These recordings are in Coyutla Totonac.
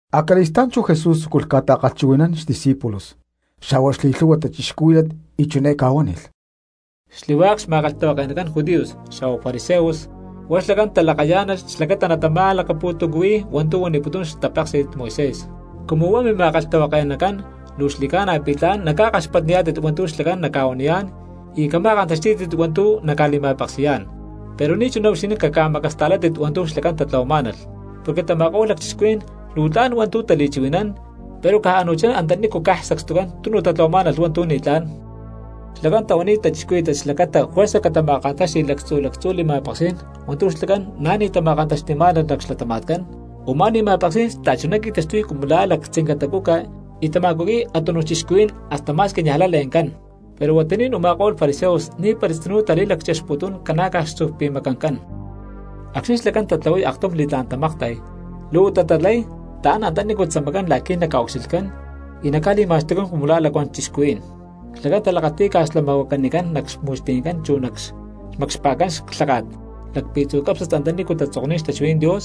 Acali̠stá̠n chú Jesús tzúculh ca̠ta̠kalhchuhui̠nán xdiscípulos xa̠huá xli̠lhu̠hua cristianos y chiné ca̠huánilh: —Xli̠hua̠k xma̠kalhtahuake̠nacán judíos xa̠huá fariseos huá xlacán talakayá̠nalh xlacata natama̠lacapu̠tuncuhui̠y hua̠ntu̠ huaniputún xtapéksi̠t Moisés. Cumu huá mima̠kalhtahuake̠nacán luu xli̠ca̠na pi̠ tla̠n naca̠kaxpatniyá̠tit hua̠ntu̠ xlacán naca̠huaniyá̠n y cama̠kantaxtí̠tit hua̠ntu̠ naca̠li̠ma̠peksi̠yá̠n; pero ni̠chuná huixinín caca̠macasta̠látit hua̠ntu̠ xlacán tatlahuamá̠nalh, porque tama̠ko̠lh lacchixcuhuí̠n luu tla̠n hua̠ntu̠ tali̠chuhui̠nán, pero caj a̠nu̠chá antanícu caj sacstucán tunu tatlahuamá̠nalh hua̠ntu̠ ni̠tlá̠n. Xlacán tahuaniy cristianos xlacata juerza catama̠kantáxti̠lh lactzu lactzú li̠ma̠peksí̠n hua̠ntu̠ xlacán na̠ ni̠ tama̠kantaxti̠má̠nalh nac xlatama̠tcán; u̠má li̠ma̠peksí̠n xta̠chuná qui̠taxtuy cumu la̠ lactzinca tacuca y tama̠cuqui̠y a̠túnuj cristianos hasta ma̠squi niajlay le̠ncán. Pero huatuní̠n u̠ma̠ko̠lh fariseos ni̠para tzinú tali̠lacchexputún ca̠na̠caj xtzu̠pi̠macancán. Acxni̠ xlacán tatlahuay aktum li̠tlá̠n tamakta̠y luhuatá tatlahuay taán antanícu tzamacán la̠qui̠ naca̠ucxilhcán, y naca̠li̠ma̠xtucán cumu la̠ lacuán cristianos. Xlacán talakati̠y ca̠slamahuacanicán nac xmu̠xti̠ncán chu nac xmacxpa̠ncán clháka̠t lacpi̠tzu̠ cápsnat antanícu tatzokni̠t xtachuhuí̠n Dios,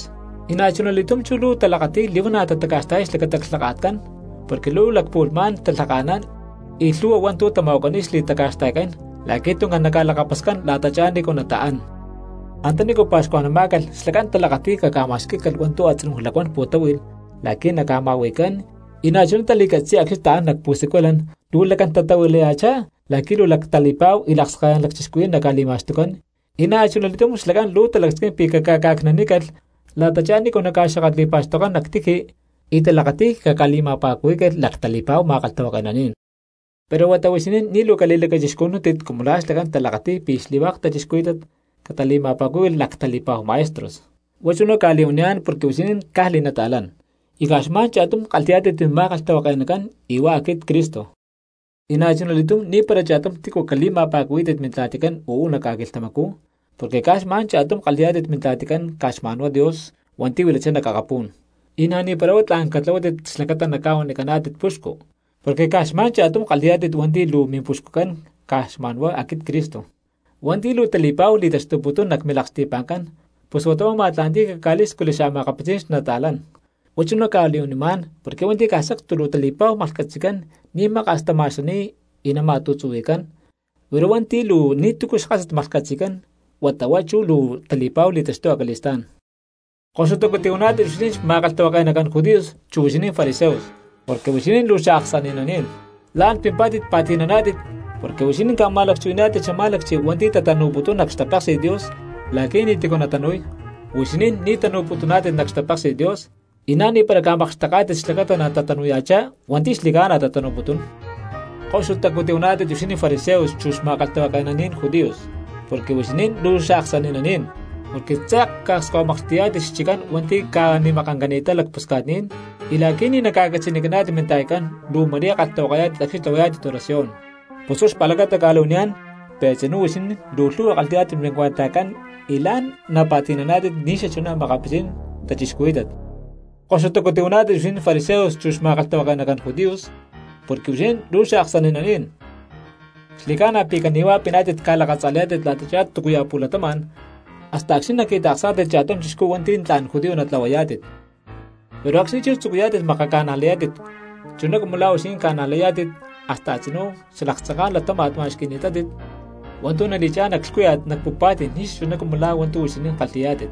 y na̠chuna li̠túm luu talakati̠y li̠huana̠ tataca̠xta̠yay xlacata clhaka̠tcán, porque luu lacpu̠lhmá̠n talhaka̠nán y lhu̠hua hua̠ntu̠ tama̠huacaniy xli̠taca̠xta̠ycán la̠qui̠ tuncán naca̠lakapascán la̠tachá nícu nataán. Antánícu pa̠xcuajnamá̠calh xlacán talakati̠y caca̠ma̠xquí̠calh hua̠ntu̠ a̠tzinú lacuán pu̠táhui̠lh la̠qui̠ naca̠ma̠hui̠cán, y na̠chuná tali̠catzi̠y acxni̠ taán nac xpu̠siculancán luu lacán tatahuilaya̠chá la̠qui̠ luu lactali̠pa̠hu y lakskalalán lacchixcuhuí̠n naca̠li̠ma̠xtucán, y na̠chuna li̠túm xlacán luu talacasquín pi̠ caca̠ca̠cni̠nanícalh la̠tachá nícu naca̠xakatli̠pa̠xtokcán nac tiji y talakati̠y caca̠li̠ma̠pa̠cuhuí̠calh lactali̠pa̠hu ma̠kalhtahuake̠naní̠n. ’Pero huata huixinín ni̠ luu cali̠lacachixcujnúntit cumu lá xlacán talakati̠y pi̠ xli̠hua̠k cristianos catali̠ma̠pa̠cúhui̠lh lactali̠pa̠hu maestros, huá chuná cca̠li̠huaniyá̠n porque huixinín caj li̠nata̠lán y caj xma̠n cha̠tum kalhi̠yá̠tit mima̠kalhtahuake̠nacán y huá aquit Cristo. Y na̠chuna li̠túm ni̠para cha̠tum tícu cali̠ma̠pa̠cuhuí̠tit mintla̠ticán uú nac ca̠quilhtamacú, porque caj xma̠n cha̠tum kalhi̠yá̠tit Mintla̠ticán caj xma̠nhuá Dios hua̠nti̠ huilachá nac akapú̠n. Y na̠ni̠para huá tla̠n catlahuátit xlacata naca̠huanicaná̠tit puxcu, porque caj xma̠n cha̠tum kalhi̠yá̠tit hua̠nti̠ luu Mimpuxcucán caj xma̠nhuá aquit Cristo. Hua̠nti̠ luu tali̠pa̠hu li̠taxtuputún nac milaksti̠pa̠ncán pus huata huá ma̠tla̠nti̠y caca̠lí̠scujli xa̠makapitzí̠n xta̠cristianos. Huá chuná cca̠li̠huanimá̠n porque hua̠nti̠ caj sacstu luu tali̠pa̠hu maklhcatzi̠cán ni̠ maka̠s tama̠xani̠y y nama̠tu̠tzuhui̠cán; pero hua̠nti̠ luu ni̠tu̠cu xkásat maklhcatzi̠cán huata huá chú luu tali̠pa̠hu li̠taxtuy acali̠stá̠n. ’¡Koxutacu tihuaná̠tit huixinín xma̠kalhtahuake̠nacán judíos chu huixinín fariseos porque huixinín luu xaaksani̠naní̠n! La̠n pimpá̠tit pa̠ti̠naná̠tit porque huixinín ca̠ma̠lacchuhuaniyá̠tit xamá̠lacchi hua̠nti̠ tatanu̠putún nac xtapéksi̠t Dios la̠qui̠ ni̠tícu natanu̠y. Huixinín ni̠ tanu̠putuná̠tit nac xtapéksi̠t Dios, y na̠ni̠para ca̠makxteká̠tit xlacata natatanu̠ya̠chá hua̠nti̠ xli̠ca̠na tatanu̠putún. ’¡Koxutacú tihuaná̠tit huixinín fariseos chu xma̠kalhtahuake̠naní̠n judíos, porque huixinín luu xaaksani̠naní̠n! Porque tze̠k ca̠akskahuimaklhti̠yá̠tit xchiccán hua̠nti̠ ca̠ni̠makancani̠t lacpusca̠tní̠n, y la̠qui̠ ni̠ naca̠catzi̠nicaná̠tit minta̠yatcán luu ma̠rí kalhtahuakayá̠tit acxni̠ tlahuayá̠tit oración. Pus huá xpa̠lacata cca̠li̠huaniyá̠n pi̠ a̠tzinú huixinín luu lhu̠hua kalhi̠yá̠tit mincuentajcán y la̠n napa̠tínaná̠tit ni̠xachuná makapitzí̠n cristianos. ’¡Koxutacu tihuaná̠tit huixinín fariseos chu xma̠kalhtahuake̠nacán judíos, porque huixinín luu xaaksani̠naní̠n! Xli̠ca̠na pi̠ cani̠huá piná̠tit ca̠lakatza̠layá̠tit la̠tachá túcuya̠ pu̠latama̠n hasta acxni̠ naqui̠ta̠ksá̠tit cha̠tum chixcú hua̠nti̠ tla̠n judío natlahuayá̠tit, pero acxni̠ tzucuyá̠tit makaca̠najlayá̠tit chuná cumu la̠ huixinín ca̠najlayá̠tit hasta a̠tzinú xalaktzanká̠n latáma̠t ma̠xqui̠ni̠tátit hua̠ntu̠ nali̠chá̠n nac lhcúya̠t nac pu̠pa̠tí̠n ni̠xachuná cumu lá hua̠ntu̠ huixinín kalhi̠yá̠tit.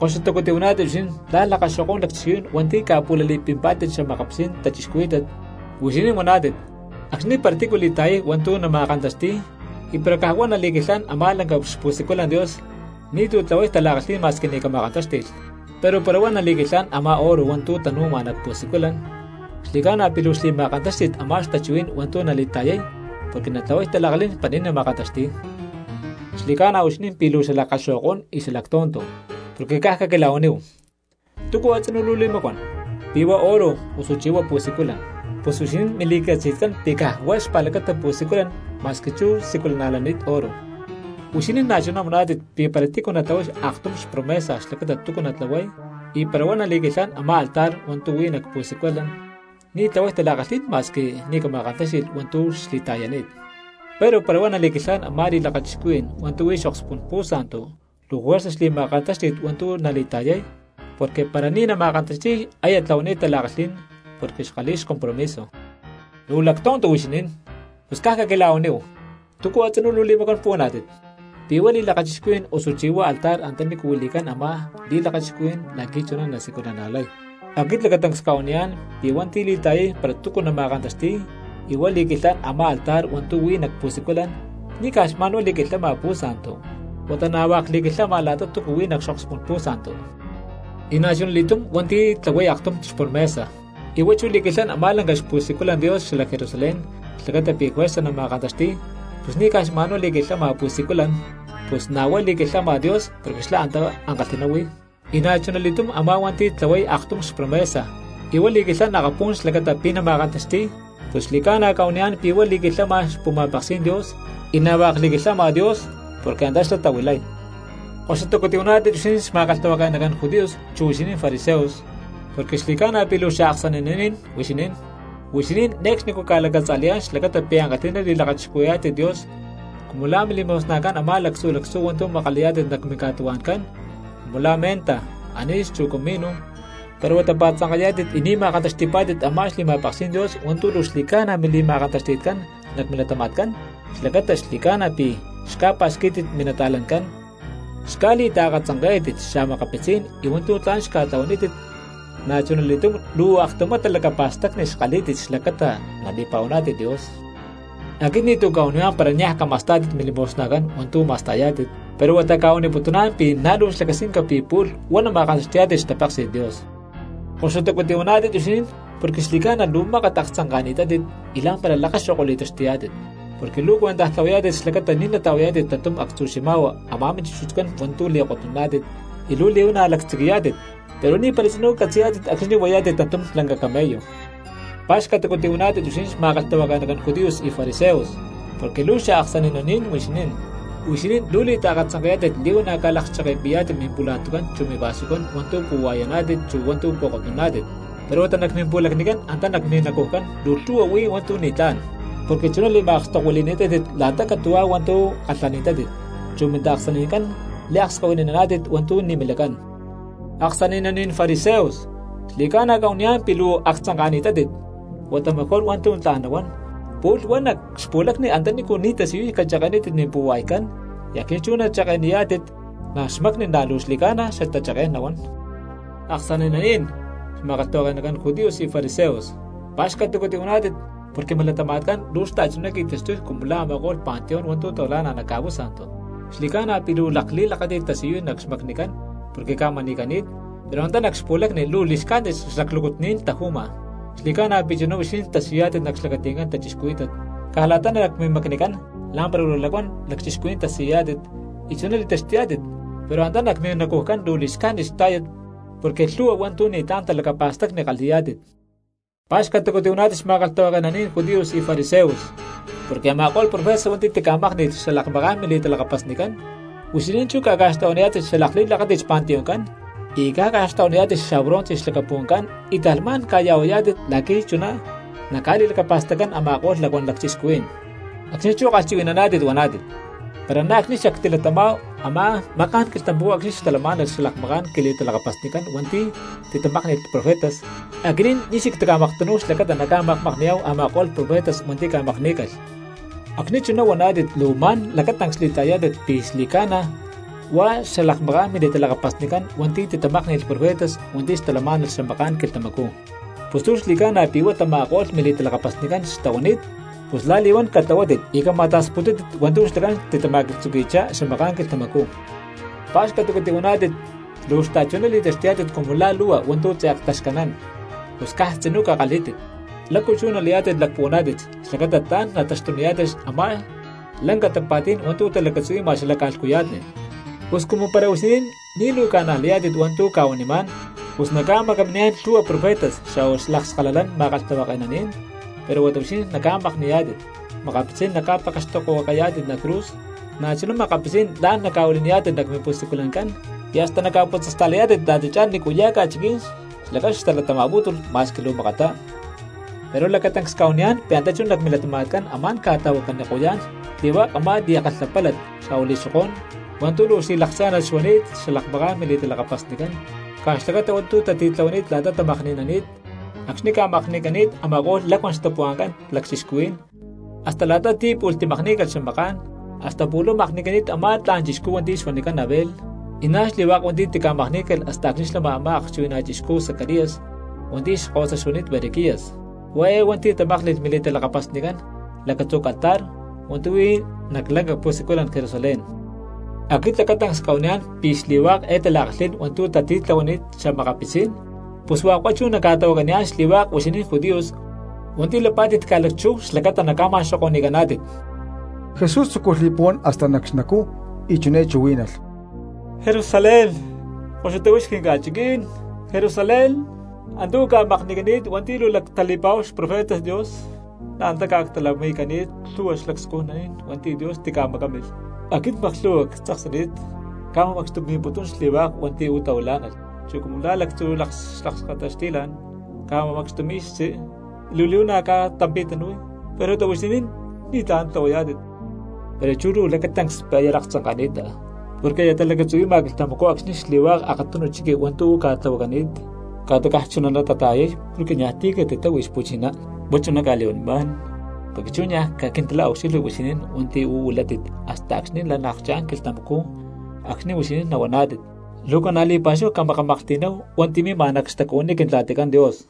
’¡Koxutacu tihuaná̠tit huixinín la̠ lakaxo̠ko̠n lacchixcuhuí̠n hua̠nti̠ ca̠pu̠lali̠pimpá̠tit xa̠makapitzí̠n cristianos! Huixinín huaná̠tit: “Acxni̠ para tícu li̠ta̠yay hua̠ntu̠ nama̠kantaxti̠y y para caj huá nali̠quilhán a̠ma̠ lanca xpu̠siculan Dios ni̠tu̠ tlahuay tala̠kalhí̠n ma̠squi ni̠ cama̠kantáxti̠lh. Pero para huá nali̠quilhán a̠má oro hua̠ntu̠ tanu̠ma nac pu̠siculan, xli̠ca̠na pi̠ luu xli̠ma̠kantáxti̠t a̠má xtachuhuí̠n hua̠ntu̠ nali̠ta̠yay porque natlahuay tala̠kalhí̠n para ni̠ nama̠kantaxti̠y.” ¡Xli̠ca̠na pi̠ huixinín luu xalakaxo̠ko̠n y xalactonto! Porque caj caquila̠huaníhu: ¿túcu a̠tzinú luu li̠macuán, pi̠ huá oro osuchí huá pu̠siculan? Pus huixinín mili̠catzi̠tcán pi̠ caj huá xpa̠lacata pu̠siculan ma̠squi chú siculana̠lani̠t oro. Huixinín na̠chuná huaná̠tit pi̠ para tícu natlahuay aktum xpromesa xlacata túcu natlahuay y para huá nali̠quilhán a̠má altar hua̠ntu̠ huí nac pu̠siculan ni̠ tlahuay tala̠kalhí̠n ma̠squi ni̠ cama̠kantáxti̠lh hua̠ntu̠ xli̠ta̠yani̠t, pero para huá nali̠quilhán a̠má li̠lakachixcuhui̠n hua̠ntu̠ huí nac xokspú̠n pu̠santu luu juerza xli̠ma̠kantáxti̠t hua̠ntu̠ nali̠ta̠yay, porque para ni̠ nama̠kantaxti̠y aya tlahuanít tala̠kalhí̠n porque xkalhi̠y xcompromiso. ¡Luu lactonto huixinín! Pus caj caquila̠huaníhu, ¿túcu a̠tzinú luu li̠macuán puhuaná̠tit, pi̠ huá li̠lakachixcuhui̠n osuchí huá altar antaní huili̠cán a̠má li̠lakachixcuhui̠n la̠qui̠ chuná nasiculana̠lay? Aquit lacatancs cca̠huaniyá̠n pi̠ hua̠nti̠ li̠ta̠yay para túcu nama̠kantaxtíy y huá li̠quilhán a̠má altar hua̠ntu̠ huí nac pu̠siculan, ni̠ caj xma̠n huá li̠quilhama pu̠santu, huata na̠ hua̠k li̠quilhama la̠ta tu̠ huí nac xokspú̠n pu̠santu. Y na̠chuna li̠túm hua̠nti̠ tlahuay aktum xpromesa y huá chú li̠quilhán a̠má lanca xpu̠siculan Dios xalac Jerusalén xlacata pi̠ juerza nama̠kantaxti̠y, pus ni̠ caj xma̠nhuá li̠quilhán pu̠siculan, pus na̠ huá li̠quilhama Dios porque xlá antá ankalhi̠ná huí. Y na̠chuna li̠túm a̠má hua̠nti̠ tlahuay aktum xpromesa y huá li̠quilhán akapú̠n xlacata pi̠ nama̠kantaxti̠y, pus xli̠ca̠na cca̠huaniyá̠n pi̠ huá li̠quilhama xpu̠ma̠peksí̠n Dios, y na̠ hua̠k li̠quilhama Dios porque antá xlá tahuilay. ’¡Koxutacu tihuaná̠tit huixinín xma̠kalhtahuake̠nacán judíos chu huixinín fariseos, porque xli̠ca̠na pi̠ luu xaaksani̠naní̠n huixinín! Huixinín ne̠cxnicú ca̠lacatza̠layá̠n xlacata pi̠ ankalhi̠ná li̠lakachixcuhuí̠yá̠tit Dios cumu lá milimosnajcán a̠má lactzu lactzú hua̠ntu̠ makalayá̠tit nac minca̠tuhua̠ncán, cumu la̠ menta, anís chu comino; pero huata pa̠tzanka̠yá̠tit y ni̠ ma̠kantaxti̠pá̠tit a̠má xli̠ma̠peksí̠n Dios hua̠ntu̠ luu xli̠ca̠na mili̠ma̠kantaxti̠tcán nac milatama̠tcán xlacata xli̠ca̠na pi̠ xca̠pa̠xquí̠tit minta̠cristianoscán, xca̠li̠taakatzanké̠tit xa̠makapitzí̠n y hua̠ntu̠ tla̠n xca̠tlahuanítit, na̠chuna li̠túm luu aktumá talacapa̠stacni xkalhí̠tit xlacata nali̠pa̠huaná̠tit Dios. Aquit ni̠tu̠ cca̠huanimá̠n para niaj cama̠stá̠tit mili̠mosnajcán hua̠ntu̠ ma̠stá̠yá̠tit, pero huata cca̠huaniputuná̠n pi̠ na̠ luu xlacasquinca pi̠ pu̠lh huá nama̠kantaxti̠yá̠tit xtapeksi̠t Dios. ¡Koxutacu tihuaná̠tit huixinín porque xli̠ca̠na luu mákat aktzanka̠ni̠tátit y la̠mpara lakaxo̠ko li̠taxtuyá̠tit! Porque luu cuentaj tlahuayá̠tit xlacata ni̠ nata̠huayá̠tit tantum actzu xima̠hua a̠má chúchut hua̠ntu̠ li̠kotnuná̠tit y luu li̠huana̠ lactziqui̠yá̠tit, pero ni̠para tzinú catzi̠yá̠tit acxni̠ huayá̠tit tantum lanca camello. ’¡Pa̠xcatacu tihuaná̠tit huixinín xma̠kalhtahuake̠nacán judíos y fariseos, porque luu xaaksani̠naní̠n huixinín! Huixinín luu li̠taakatzanke̠yá̠tit li̠huana̠ ca̠lakcheke̠pi̠yá̠tit mimpula̠tucán chu mivasucán hua̠ntu̠ pu̠hua̠yaná̠tit chu hua̠ntu̠ pu̠kotnuná̠tit, pero huata nac mimpu̠lacnicán antá nac minacujcán luu lhu̠hua huí hua̠ntu̠ ni̠tlá̠n, porque chuná li̠ma̠akstokuili̠ni̠tátit la̠ta catu̠huá hua̠ntu̠ kalhani̠tátit, chu mintaaksani̠ncán liakskahuinini̠tátit hua̠ntu̠ ni̠ milacán. ¡Aksani̠naní̠n fariseos, xli̠ca̠na cca̠huaniyá̠n pi̠ luu aktzanka̠ni̠tátit! Huata mejor hua̠ntu̠ tla̠n nahuán pu̠lh huá nac xpu̠lacni antanícu ni̠ tasiyuy cacheke̠nítit mimpu̠hua̠ycán, y acxni̠ chú nalakcheke̠yá̠tit nac xmacni luu xli̠ca̠na xatacheké̠n nahuán. ’¡Aksani̠naní̠n! Xma̠kalhtahuake̠nacán judíos y fariseos, pa̠xcatacu tihuaná̠tit porque milatama̠tcán luu xta̠chuná qui̠taxtuy cumu la̠ a̠ma̠ko̠lh panteón hua̠ntu̠ tahuilá̠nalh nac ca̠pú̠sa̠ntu. Xli̠ca̠na pi̠ luu lakli̠lakáti̠t tasiyuy nac xmacnicán porque ca̠mani̠cani̠t, pero antá nac xpu̠lacni luu li̠xcájnit xlaclúcut ni̠n taju̠ma. Xli̠ca̠na pi̠ chuná huixinín tasiyuyá̠tit nac xlacati̠ncán cristianos; caj la̠ta nac mimacnicán la̠mpara luu lacuán cristianos tasiyuyá̠tit y chuná li̠taxtuyá̠tit, pero antá nac minacujcán luu li̠xcájnit xtá̠yat porque lhu̠hua hua̠ntu̠ ni̠tlá̠n talacapa̠stacni kalhi̠yá̠tit. ’¡Pa̠xcatacu tihuaná̠tit xma̠kalhtahuake̠naní̠n judíos y fariseos, porque a̠ma̠ko̠lh profetas hua̠nti̠ tica̠mákni̠lh xalakmaká̠n mili̠talakapasnicán, huixinín chú ca̠ca̠xtlahuaniyá̠tit xalakli̠lakáti̠t xpanteoncán, y ca̠ca̠xtlahuaniyá̠tit xabronce xlacapu̠ncán y ta̠lhmá̠n ca̠ya̠huayá̠tit la̠qui̠ chuná naca̠li̠lacapa̠staccán a̠ma̠ko̠lh lacuán lacchixcuhuí̠n! Acxni̠ chú kalhchuhui̠naná̠tit huaná̠tit: “Para na̠ acxni̠ xactilatamá̠hu a̠má maká̠n quilhtamacú acxni̠ xtalamá̠nalh xalakmaká̠n quili̠talakapasnicán hua̠nti̠ titamákni̠lh profetas, aquinín ni̠ xactimaktanú̠hu xlacata nacca̠makmakni̠yá̠hu a̠ma̠ko̠lh profetas hua̠nti̠ ca̠makní̠calh.” Acxni̠ chuná huaná̠tit luu ma̠n lacatancs li̠ta̠yayá̠tit pi̠ xli̠ca̠na huá xalakmaká̠n mili̠talakapasnicán hua̠nti̠ titamákni̠lh profetas hua̠nti̠ xtalamá̠nalh xamaká̠n quilhtamacú. Pus luu xli̠ca̠na pi̠ huá tama̠ko̠lh mili̠talakapasnicán xtahuani̠t, pus la̠li̠huán catlahuátit y cama̠ta̠sputútit hua̠ntu̠ xlacán titama̠tzuqui̠chitá xamaká̠n quilhtamacú. ’¡Pa̠xcatacu tihuaná̠tit, luu xta̠chuná li̠taxtuyá̠tit cumu la̠ lu̠hua hua̠ntu̠ tze̠k taxcanán! Pus caj tzinú cakalhí̠tit, ¿lácu chú nalayá̠tit lacpuhuaná̠tit xlacata tla̠n nataxtuniyá̠tit a̠má lanca tapa̠tí̠n hua̠ntu̠ talacatzuhui̠ma xala ca̠lhcuya̠tni? Pus cumu para huixinín ni̠ luu ca̠najlayá̠tit hua̠ntu̠ cca̠huanimá̠n, pus nacca̠macaminiyá̠n lhu̠hua profetas xa̠hua lakskalalán ma̠kalhtahuake̠naní̠n; pero huata huixinín naca̠makni̠yá̠tit, makapitzí̠n naca̠pekextokohuacayá̠tit nac cruz, na̠chuná makapitzí̠n la̠n naca̠huili̠niyá̠tit nac mimpu̠siculancán, y hasta naca̠putzasta̠layá̠tit la̠tachá nícuya̠ ca̠chiquí̠n xlacán natalatama̠putún ma̠squi luu makattá. Pero lacatancs cca̠huaniyá̠n pi̠ antá chú nac milatama̠tcán amá̠n ca̠tahuacaniko̠yá̠n xli̠hua̠k a̠má li̠kalhapálat xa̠hua li̠xokó̠n hua̠ntu̠ luu xli̠lakcha̠nat xuani̠t xalakmaká̠n mili̠talakapasnicán caj xlacata hua̠ntu̠ tatitlahuani̠t la̠ta tamakni̠nani̠t, acxni̠ ca̠makni̠cani̠t a̠ma̠ko̠lh lacuán xtapuhua̠nca̠n cristianos hasta la̠ta ti̠ pu̠lh timakní̠calh xamaká̠n, hasta púlh huá makni̠cani̠t a̠má tla̠n chixcú hua̠nti̠ xuanicán Abel, y na̠ xli̠hua̠k hua̠nti̠ tica̠makní̠calh hasta acxni̠ xlama a̠má akchuhui̠na chixcú Zacarías hua̠nti̠ xkahuasa xuani̠t Berequías, hua̠ eé hua̠nti̠ tamákni̠lh mili̠talakapasnicán lacatzú altar hua̠ntu̠ huí nac lanca pu̠siculan cJerusalén. Aquit lacatancs cca̠huaniyá̠n pi̠ xli̠hua̠k eé tala̠kalhí̠n hua̠ntu̠ tatitlahuani̠t xa̠makapitzí̠n, pus hua̠k huá chú naca̠tahuacaniyá̠n xli̠hua̠k huixinín judíos hua̠nti̠ lapá̠tit ca̠lacchú xlacata naca̠ma̠xoko̠ni̠caná̠tit. Jesús tzúculh li̠puhuán hasta nac xnacú y chiné chuhuí̠nalh: —Jerusalén, ¡koxuta huix quinca̠chiquí̠n Jerusalén! Antá uú ca̠makni̠cani̠t hua̠nti̠ luu lactali̠pa̠hu xprofetas Dios, na̠ antá ca̠actalamakni̠cani̠t lhu̠hua xlacscujní̠n hua̠nti̠ Dios tica̠macámilh. Aquit maklhu̠hua ctzaksani̠t cca̠ma̠macxtumi̠putún xli̠hua̠k hua̠nti̠ uú tahuilá̠nalh chuná cumu la̠ lactzú xalakskata xti̠la̠n ca̠ma̠macxtumi̠y xtzí y luu li̠huana̠ ca̠tampi̠tanu̠y, pero huata huixinín ni̠tlá̠n tlahuayá̠tit. Pero chú luu lacatancs pi̠ aya laktzanka̠ni̠ta, porque aya talacatzuhui̠ma quilhtamacú acxni̠ xli̠hua̠k akatunu chiqui hua̠ntu̠ uú ca̠tlahuacani̠t ca̠ta caj chunatá natata̠yay porque niaj ti̠ catitáhui xpu̠chiná. Huá chuná cca̠li̠huanimá̠n porque chú niaj caquintila̠ucxilhui huixinín hua̠nti̠ uú huilátit hasta acxni̠ nalakchá̠n quilhtamacú acxni̠ huixinín nahuaná̠tit: “¡Luu ca̠na̠ li̠pa̠xúhu cmakamaklhti̠nama̠náhu hua̠nti̠ mima nac xtacuhuiní Quintla̠ticán Dios!”